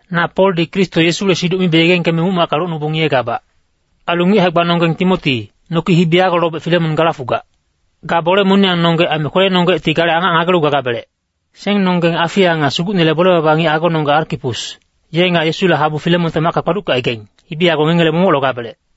Na Poldi Kristo Yesule siduc mibe yegengkeme muc-macka locnubong ngiyegabac. Ailu ngic hae-gbanonggeng Timoti, noki hibi yago lobec Filemon gala fugac. Ga bole moniyangnonggec aime kwelenonggecti gale angac ngagelu gagabelec. Sengnonggeng Afia nga Sugucnele bole-baba ngic agononggec Arkipus, ye nga Yesule habu Filemonte macka kpaduckecaigaing, hibi yago ngengele momoc logabelec.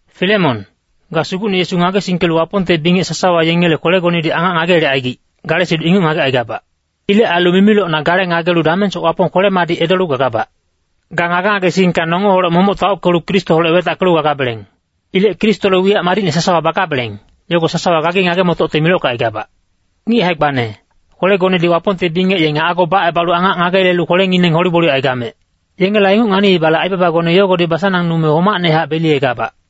Filemon, ga Sugucne Yesu ngagesingkelu Wapongte bingec sasawa yengele kwelegonedi angac ngageyelecaigic, gale siduc inguc ngagecaigabac. Ilec ailu mimilocna gale ngagelu damengsoc Wapong kwele-madic edolu gagabac. Ga ngage-ngagesingka nongeholec momoc taockelu Kristoholec wetackelu gagabeleng. Ilec Kristole wiyac madicne sasawa bagabeleng, yogo sasawa gagi ngage-motocte milockecaigabac. Ngic hae-gbane, kwelegonedi Wapongte bingec yenge ago bacebalu angac ngageyelelu kwelengineng hole-gboliyecaigamec. Yengela inguc nganiibale aibabagone yogodi basanangnume homacnehac beliyegabac.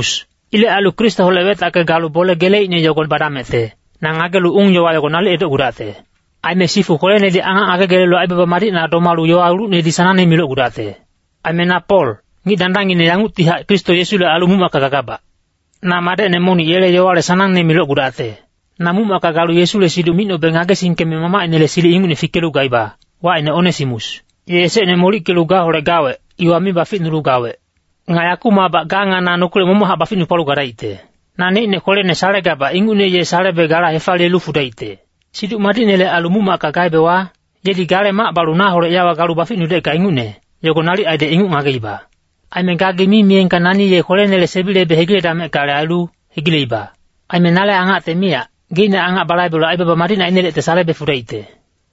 Ilec ailu Kristoholec wetacke galu bole geleicne yogo badamecte, na ngagelu ung-yowa yogo nalic edocgudacte. Aime sifu kweledi angac ngagegelelu aibaba madicna domalu yowa ulucnedi sanangne milocgudacte. Aime na Pol, ngic dandangngine yanguctihac Kristo Yesule ailu muc-macka gagabac. Na madecne monic yele yowale sanangne milocgudacte. Na muc-macka galu Yesule siduc micnobe ngagesingkeme mamacinele silic ingucne fikelu gaiba, wacine Onesimus. Ye esecne molickelu gaholec gawec, iwa mi baficgulu gawec. Nga yakumacbac ga nga na nokilec momochac baficnupalu gadaicte. Naneicne kwelene salegabac ingucne ye salebe gala hefaliyelu fudaicte. Siduc Madicnele ailu muc-macka gaebewa, yedi gale mac balu naholec yawa galu baficnudecka ingucne, yogo nalic aidec inguc ngageiba. Aime gagi mi miyengka nani ye kwelenele sebilebe hegiledameckale ailu, hegileiba. Aime nale angacte miyac, geicne angac balaibelu aibaba madicne ainelecte salebe fudaicte.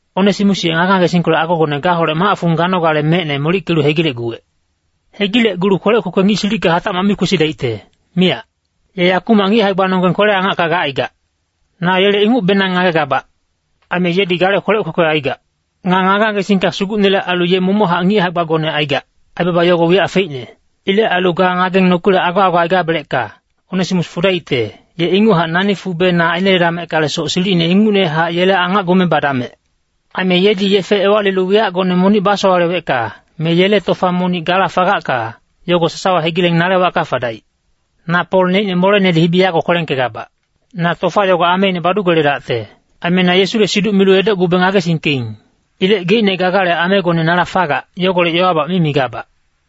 Onesimus ye ngage-ngagesingkolec agogone gaholec mac-fung ganogale mecne molickelu hegilecguwec. Hegilecgulu kwelec kwekwe ngic silicka hatacmac mi kwesidaicte, miyac. Ye yakumac ngic hae-gbanonggeng kwele-angacka gacaigac. Na yele ingucbenang ngagegabac. Aime yedi gale kwelec kwekwe aigac. Nga ngage-ngagesingka Sugucnele ailu ye momochac ngic hae-gbagone aigac, aibaba yogo wiyac feicne. Ilec ailu ga ngageng nokilec ago-ago aigabelecka, Onesimus fudaicte, ye inguchac nani fube na aineledameckalesoc silicine ingucnehac yele angacgume badamec. Aime yedi yefe ewalilu wiyacgone monic basowalewecka, me yele tofa monic gala fagacka, yogo sasawa hegileng nale wacka fadaic. Na Pol neicne molenedi hibi yago kwelengkegabac. Na tofa yogo ameine badugeledacte. Aime na Yesule siduc milu edocgube ngagesingkeing. Ilec geicne gagale amegone nala fagac, yogolec yowabac mi migabac.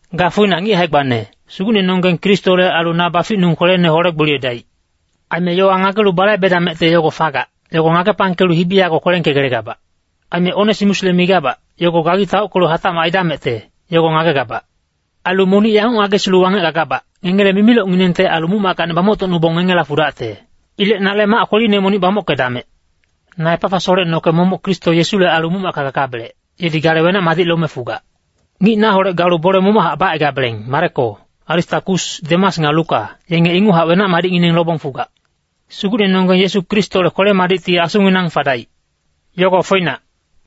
Ga foinac ngic hae-gbane, Sugucnenonggeng Kristole ailu na baficnung kwelene hole-gboliyedaic. Aime yowa ngagelu balaibedamecte yogo fagac, yogo ngagepangkelu hibi yago kwelengkegelegabac. Aime Onesimusle migabac, yogo gagi taockelu hatacmac aidamecte, yogo ngagegabac. Ailu monic yanguc ngagesilu wangec gagabac, ngengele mimilocnginengte ailu muc-mackacni bamoctocnubong ngengela fudacte. Ilec nale mac kweline monic bamockedamec. Na Epafasholec noke momoc Kristo Yesule ailu muc-macka gagabelec, yedi gale wenac-madic lome fugac. Ngic naholec galu bole momochac bacaigabeleng Mareko, Aristakus, Demas nga Luka, yenge inguchac wenac-madicngineng lobong fugac. Sugucnenonggeng Yesu Kristole kwele-madicti asunginang fadaic. Yogo foinac.